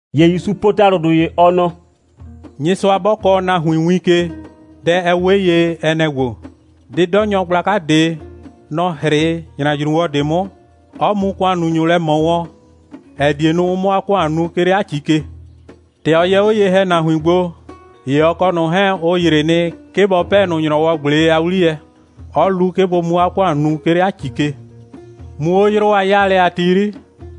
(‑Ye ‑Yusu po ‑talʋdʋ ‑ye, ɔ nɔ:) «Nyɩsʋa 'bɔ kɔɔ nahuin win ke, dɛ, ɛ 'we ye, ɛ nɛ‑ ‑gbo: 'Dɩdɔnyɔ gblaka ꞊de, nɔ‑ 'hrɩ ‑nyrajruwɔ ꞊de 'mʋ, 'ɔ mu ‑kʋannunyʋ lɛ ꞊mɔ wɔn, ‑ɛ die nu, ʋ 'mʋ 'a ‑kʋan nu, 'ke 'le 'a ‑ci ke. ‑Tɛ ɔ yɛ 'o ye‑hɛnahuin gbo, ‑ye ɔ kɔ ꞊nʋ 'hɛɛn, ʋ ‑yrɩ nɩ, 'ke bɔ 'pɛɛ ꞊nʋ ‑nyrɔwɔ꞊gble a 'wliyɛ, 'ɔ lu, 'ke bʋ mu 'a ‑kʋan nu, 'ke 'le 'a ‑ci ke. Muu 'o 'yrʋ a 'o'yaalɛ a ti 'yri,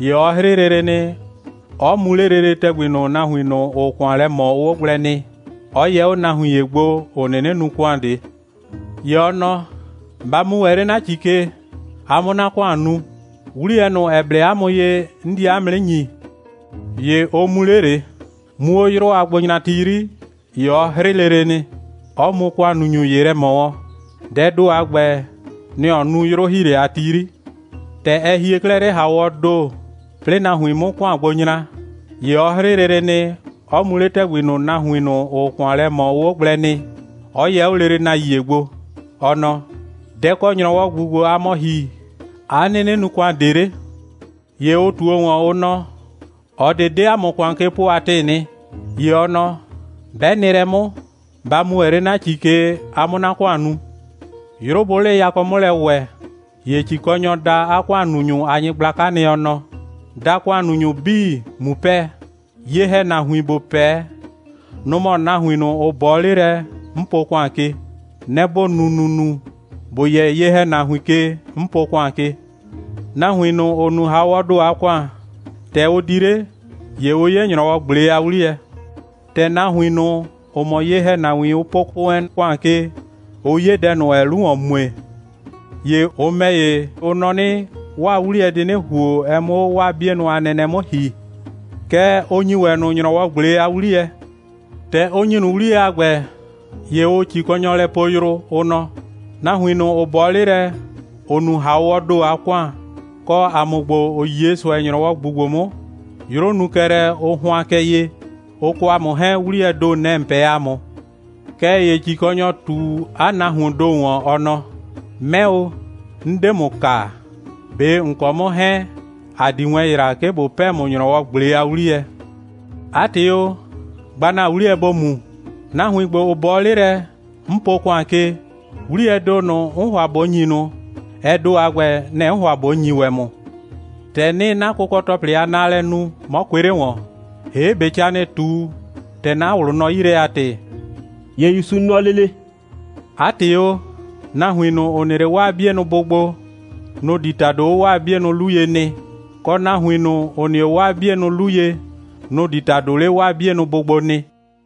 ‑ye ɔ 'hrɩ lele nɩ, 'ɔ mu 'le lele ‑tɛgbi ꞊nʋ, nahuin ꞊nʋ, ‑ʋʋ ‑kʋan lɛ ꞊mɔ, ʋʋ 'o gblɛ nɩ, 'ɔ yɛ 'o nahuin ‑ye gbo, ‑ʋ 'nɩnɩ nu ‑kʋan ꞊de. ‑Ye ɔ nɔ: Ba mu ‑wɛ 'le 'na ‑ci ke, a 'mʋ 'na ‑kʋan nu. 'Wliyɛ ꞊nʋ, ‑ɛ blɛ 'a mʋ ye, 'n die 'a mʋ 'nɩ ‑nyi. ‑Ye ʋ mu 'le ꞊le. Muu 'o 'yrʋ a gbonyrati 'yri, ‑ye ɔ 'hrɩ lele nɩ, 'ɔ mu ‑kʋannunyʋ ‑ye lɛ ꞊mɔ wɔn. Dɛɛ ‑do a ‑gbɛ, nɛ‑ ɔ nu 'yrʋ‑hiilɛ a ti 'yri. ‑Tɛ ɛ hie 'klɛɛ 'le ‑hawɔɔ ‑do, 'plɩɩ nahuin 'mʋ ‑kʋan gbo nyra, ‑ye ɔ 'hrɩ lele nɩ, 'ɔ mu 'le ‑tɛgbi ꞊nʋ, nahuin ꞊nʋ, ‑ʋʋ ‑kʋan lɛ ꞊mɔ, ʋʋ 'o gblɛ nɩ, 'ɔ yɛ 'o lele nahuin ‑ye gbo. Ɔ nɔ: Dɛ‑ kɔ ‑nyrɔwɔ ꞊gbu ‑gbo, aa mɔ ‑hi, 'a 'nɩnɩ nu ‑kʋan ꞊de 'le? ‑Ye ʋ ꞊tuo ‑wɔn, ʋ nɔ: ꞊Ɔ ꞊de 'de ‑a mʋ ‑kʋan ke po a ‑tɩɩ nɩ. ‑Ye ɔ nɔ: 'Bɛ nɩ lɛ 'mʋ, ba mu ‑wɛ 'le 'na ‑ci ke, a 'mʋ 'na ‑kʋan nu. 'Yrʋ bʋʋ 'le yakɔ 'mʋ lɛ ‑wɛ, ‑ye ‑cikɔnyɔ da 'a ‑kʋannunyʋ a nyɩgblaka nɩ, ɔ nɔ: Da ‑kʋannunyʋ 'bii, ꞊mu 'pɛɛ. Ye‑hɛnahuin, ‑bo 'pɛɛ, nʋ‑ mɔ nahuin ꞊nʋ, ‑ʋ 'bɔɔ 'le lɛ, 'n po ‑kʋan ke. Nɛ‑ ‑bo nu ‑nunu, ‑bo yɛ ye‑hɛnahuin ke, 'n po ‑kʋan ke. Nahuin ꞊nʋ, ‑ʋ nu ‑hawɔɔ ‑do a ‑kʋan, ‑tɛ ʋ di 'le, ‑ye ʋ 'ye ‑nyrɔwɔ꞊gble a 'wliyɛ. ‑Tɛ nahuin ꞊nʋ, ‑ʋ mɔ ye‑hɛnahuin, ʋ po wɛn ‑kʋan ke, ʋ 'ye dɛ ꞊nʋ, ‑ɛɛ 'lu ‑wɔn mue, ‑ye ʋ ‑mɛ ‑ye, ʋ nɔ 'nɩ, 'waa 'wliyɛ di 'nɩ ‑huo, ɛ 'mʋ 'o 'waa 'bienʋ a nɛnɛ 'mʋ ‑hi. Kɛɛ, ʋ ‑nyi ‑wɛ ꞊nʋ ‑nyrɔwɔ꞊gble a 'wliyɛ. ‑Tɛ ʋ ‑nyi ꞊nʋ 'wliyɛ a ‑gbɛ, ‑ye ʋʋ ‑cikɔnyɔ lɛ poo yrʋ, ʋ nɔ: Nahuin ꞊nʋ, ‑ʋ 'bɔɔ 'le lɛ, ‑ʋ nu ‑hawɔɔ ‑do a ‑kʋan, kɔ ‑a mʋ ‑gbo, ‑ʋ 'ye ꞊sʋɛ, ‑nyrɔwɔ ꞊gbu ‑gbo 'mʋ, 'yrʋ nu kɛ lɛ, ʋ hʋan kɛ ye, ʋ kɔ ‑a mʋ 'hɛɛn, 'wliyɛɛ ‑do, nɛ‑ ‑n 'pɛɛ ‑a mʋ. Kɛɛ ‑ye ‑cikɔnyɔ ꞊tu 'a nahuoon ‑do ‑wɔn, ɔ nɔ: 'Mɛ o, 'n 'de ‑mʋ kaa. ꞊Be ‑n kɔ 'mʋ 'hɛɛn, ‑a 'di wɛn ‑yra, 'ke ꞊bo 'pɛɛ ‑mʋ ‑nyrɔwɔ꞊gble a 'wliyɛ. 'A ‑tɩ o, gba ‑na 'wliyɛ, ‑bo mu. Nahuin ‑gbo, ‑ʋ 'bɔɔ 'le lɛ, 'n po ‑kʋan ke, 'wliyɛɛ ‑do ꞊nʋ, 'n ‑hʋa ꞊bo ‑nyi ꞊nʋ, ɛ ‑do a ‑gbɛ, nɛ‑ 'n ‑hʋa ꞊bo ‑nyi ‑wɛ ‑mʋ. ‑Tɛ 'nɩɩ 'na kʋkɔ‑tɔplɩ a naalɛ nu, 'mɔ kʋɩ 'le ‑wɔn. ‑Hee', ꞊be ca ‑nɩɩ ꞊tu, ‑tɛ 'na ꞊wlʋ nɔ 'yi lɛ a ‑tɩ?» ‑Ye ‑Yusu nɔ lele: «'A ‑tɩ o, nahuin ꞊nʋ, ‑ʋ nɩ 'le 'waa 'bienʋ bʋ gbo, nʋ‑ di ‑tado 'o 'waa 'bienʋ 'lu ye nɩ, kɔ, nahuin ꞊nʋ, ‑ʋ nɩ 'o 'waa 'bienʋ 'lu ye, nʋ‑ di ‑tado 'le 'waa 'bienʋ bʋ gbo nɩ.»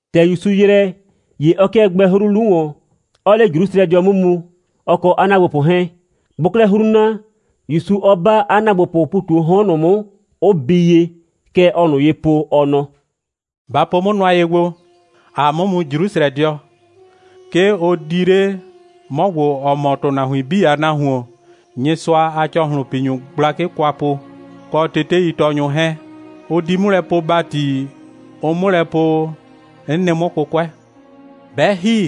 ‑Tɛ ‑Yusu ‑yrɛ, ‑ye ɔ 'kɩɛ gbɛɛ 'hru 'lu ‑wɔn, 'ɔɔ 'le Jrusrɛdɩɔ 'mʋ mu, ɔ kɔ 'a ‑naagbopʋ 'hɛɛn. Bʋʋ 'klɛɛ 'hru na, ‑Yusu 'ɔ 'ba 'a ‑naagbopʋʋ ‑pu ꞊tu 'o 'hɔn ꞊nʋ 'mʋ, 'ʋ bii ye. Kɛ ɔɔ ꞊nʋ ye po, ɔ nɔ: «Ba po 'mʋ nʋa ye gbo. ‑Aa 'mʋ mu Jrusrɛdɩɔ. 'Ke ʋ di 'le 'mɔ ‑gbo, ‑ɔ mɔ ‑tʋnahuin 'bii a Nahuon, Nyɩsʋa a ‑cɔhlʋnpinyʋ gblakɩ kwa po, kɔ teteitɔɔnyʋ 'hɛɛn. Ʋ di 'mʋ lɛ poo ‑bati, ʋ 'mʋ lɛ po, 'n nɩ 'mʋ 'kʋkʋɛ. 'Bɛ ‑hi,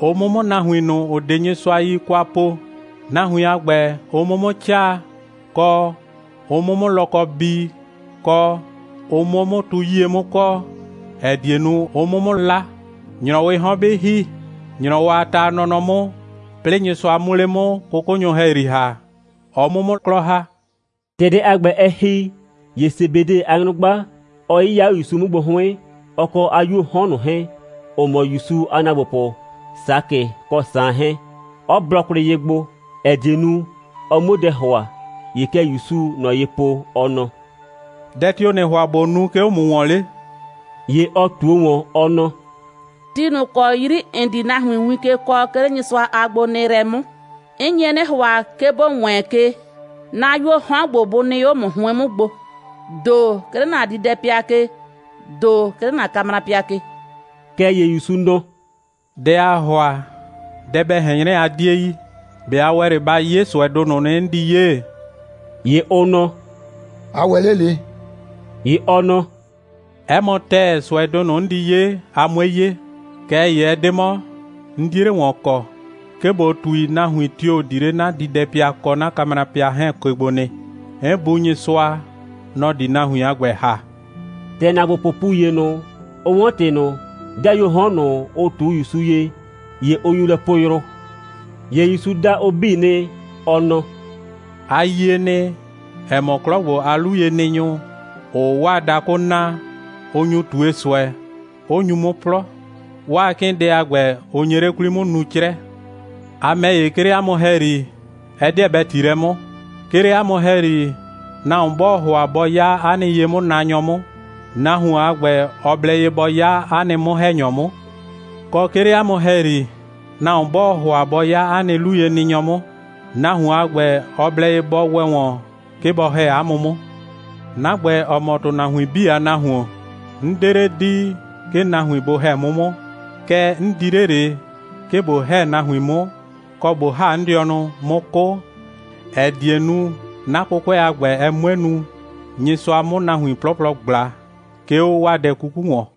ʋ 'mʋ 'mʋ nahuin ꞊nʋ, ‑ʋ 'de Nyɩsʋa yi kwa po, nahuin a ‑gbɛ, ʋ 'mʋ 'mʋ 'caa, kɔ, ʋ 'mʋ 'mʋ lɔkɔ bii, kɔ, ʋ 'mʋ 'o 'mʋ tu 'yie 'mʋ kɔɔ, ‑ɛ die nu, ʋ 'mʋ 'mʋ 'la. ‑Nyrɔwɩɩ 'hɔn 'bɩ ‑hi, ‑nyrɔwɔ a ta a nɔnɔ 'mʋ, 'plɩɩ Nyɩsʋa 'mʋ 'le 'mʋ 'kʋkʋnyʋ ‑hɛyri ‑ha, ɔ 'mʋ 'mʋ 'klɔ ‑ha.» ‑Tɛ dɛ a ‑gbɛ, ɛ ‑hi, ‑ye Sebede a nyrʋgba, ɔ 'yɩya 'o ‑Yusu 'mʋ gbo 'hʋɩn, ɔ kɔ 'a 'yuoo 'hɔn ꞊nʋ 'hɛɛn, ‑ʋ mɔ ‑Yusu a ‑naagbopʋ Sakɩ kɔ Saan 'hɛɛn, 'ɔ blɔ kwlɩ ye gbo, ‑ɛ die nu, ɔ 'muo dɛ ‑hʋa. ‑Ye kɛ ‑Yusuu ꞊nɔ ye po, ɔ nɔ: «Dɛ tio‑ ‑nɩɩ ‑hʋa ꞊bo nu, 'ke 'o ‑mʋ ‑wɔn 'le?» ‑Ye ɔ ꞊tuo ‑wɔn, ɔ nɔ: «Ti ꞊nʋ ‑kɔ 'yri ‑n di nahuin win ke kɔɔ, 'ke 'le Nyɩsʋa a gbonɩɩlɛ 'mʋ, 'n nye 'nɩ ‑hʋa, 'ke ‑bo wɛɛn ke, 'na 'yuoo 'hɔn ‑gbo, bʋ nɩ 'o ‑mʋ 'hʋɩn 'mʋ gbo, ‑do 'ke 'le ‑na diidɛpɩa ke, ‑do ‑ye 'ke 'le ‑na kamrapɩa ke.» Kɛɛ ‑ye ‑Yusu nɔ: «Dɛ aa ‑hʋa, dɛ bɛ ꞊hɛn 'nyrɛ, a 'die yi. ꞊Be a ‑wɛ 'le ba 'ye ꞊sʋɛdʋ ꞊nʋ nɩ, 'n di 'ye?» ‑Ye ʋ nɔ: «‑A ‑wɛ 'le ꞊le.» ‑Ye ɔ nɔ: «'Ɛ mɔ ‑tɛɛ, ꞊sʋɛdʋ ꞊nʋ, 'n di 'ye, a 'mue 'ye. Kɛɛ ‑ye ɛ 'de 'mɔ, 'n 'die 'le ‑wɔn kɔ, 'ke ꞊bo ꞊tui, nahuin tio‑ di 'le 'na diidɛpɩa kɔ 'na kamrapɩa 'hɛɛn ke gbo nɩ. 'N Bu Nyɩsʋa, nɔ‑ di nahuin a ‑gbɛ ‑ha.» ‑Tɛ ‑naagbopʋʋ ‑pu ‑ye ꞊nʋ, ʋ 'wɔn ‑tɩ ꞊nʋ, 'dɩayuoo 'hɔn ꞊nʋ, ʋ ꞊tu ‑Yusu ye, ‑ye ʋ nyu lɛ poo yrʋ. ‑Ye ‑Yusu da ʋ 'bii nɩ, ɔ nɔ: «A yie nɩ, ‑ɛ mɔ, 'klɔ ‑gbo a 'luyenɩnyʋ, ‑ʋʋ 'waa dakʋ naa, ʋ nyu ꞊tue ꞊sʋɛ, 'ʋ nyu 'mʋ 'plɔ. 'Waa 'kɩɩndɛ a ‑gbɛ, ʋ nye 'le 'kwli 'mʋ nuu 'crɛ. A ‑mɛ ‑ye, 'ke 'le 'a mʋ ‑hɛyri, ɛ 'deɛ bɛ ‑ti lɛ 'mʋ. 'Ke 'le 'a mʋ ‑hɛyri, nahuon 'bɔɔ ‑hʋa bɔ 'ya 'a nɩ ye'mʋnaanyɔ 'mʋ, nahuon a ‑gbɛ, ɔ blɛ ye bɔ 'ya 'a nɩ 'mʋ‑hɛnyɔ 'mʋ. Kɔ, 'ke 'le 'a mʋ ‑hɛyri, nahuon 'bɔɔ ‑hʋa bɔ 'ya 'a nɩ 'luyenɩnyɔ 'mʋ, nahuon a ‑gbɛ, ɔ blɛ ye bɔ ‑wɛ ‑wɔn, 'ke bɔ ‑hɛ 'a mʋ 'mʋ. 'Na ‑gbɛ, ‑ɔ mɔ ‑tʋnahuin 'bii a Nahuon, 'n 'de 'le di, 'ke nahuin bʋ ‑hɛ 'mʋ 'mʋ, kɛɛ, 'n di 'le ꞊le, 'ke ꞊bo ‑hɛ nahuin 'mʋ, kɔ, ꞊bo ‑ha 'n dɩɔnʋ, 'mʋ 'kʋ, ‑ɛ die nu, 'na 'kʋkʋɛ a ‑gbɛ, ɛ 'mue nu, Nyɩsʋa 'mʋ nahuin 'plɔplɔ ꞊gbla, 'ke 'o 'waa dɛ 'kuku ‑wɔn.»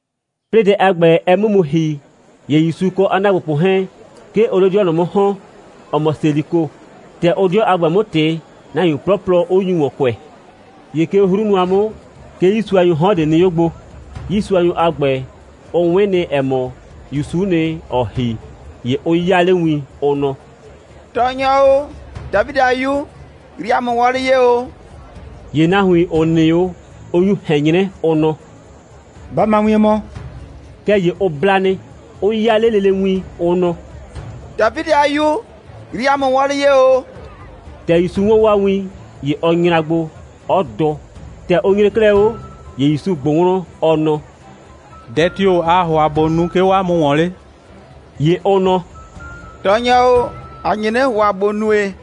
'Plɩɩ dɛ a ‑gbɛ, ɛ 'mʋ mu ‑hi, ‑ye ‑Yusu kɔ 'a ‑naagbopʋ 'hɛɛn, 'ke ʋʋ 'le 'dɩɔ ꞊nʋ 'mʋ ‑hɔn, ‑ɔ mɔ Seliko. ‑Tɛ ʋʋ 'dɩɔ a ‑gbɛ 'mʋ ꞊tɩ, nahuin 'plɔplɔ, 'ʋ nyu ‑wɔn kʋɛ. ‑Ye 'ke 'o 'hru nʋa 'mʋ, 'ke 'yiisuanyʋʋ 'hɔn ꞊de nɩ 'o gbo. 'Yiisuanyʋ a ‑gbɛ, ʋ 'wɩn nɩ, ‑ɛ mɔ, ‑Yusu'u nɩ, ‑ɔɔ ‑hi. ‑Ye ʋ 'yaa 'le win, ʋ nɔ: «Tɔɔnyɔ o, Dafidɩ a 'Yu, yrii ‑a mʋ wɔlɩ ye ‑o!» ‑Ye nahuin, ‑ʋ nɩ 'o, ʋ nyu ꞊hɛn 'nyrɛ, ʋ nɔ: «Ba ma wien mɔ!» Kɛɛ ‑ye ʋ bla nɩ, 'ʋ 'yaa 'le lele win, ʋ nɔ: «Dafidɩ a 'Yu, yrii ‑a mʋ wɔlɩ ye ‑o!» ‑Tɛ ‑Yusu 'wɔn 'waa win, ‑ye ɔ nyra gbo, 'ɔ dʋ. ‑Tɛ ʋ nyre 'klɛɛ 'o, ‑ye ‑Yusu ꞊gbʋ wlɔn, ɔ nɔ: «Dɛ tio‑ aa ‑hʋa, ꞊bo nu, 'ke 'o 'a mʋ ‑wɔn 'le?» ‑Ye ʋ nɔ: «Tɔɔnyɔ o, ‑a nye 'nɩ ‑hʋa, ‑bo nue,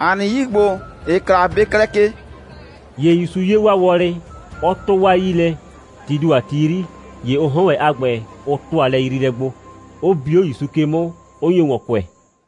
‑a nɩ 'yii ‑gbo, ‑ɩɩ kla, bɩ klɛ ke!» ‑Ye ‑Yusu 'ye 'waa wɔlɩ, 'ɔ 'tʋ 'waa 'yii lɛ. Tii ‑do a ti 'yri, ‑ye ʋ 'hɔn ‑wɛ a ‑gbɛ, ʋ ‑tʋa lɛyriilɛ gbo, 'ʋ bi 'o ‑Yusu ke 'mʋ, 'ʋ nyo ‑wɔn kʋɛ.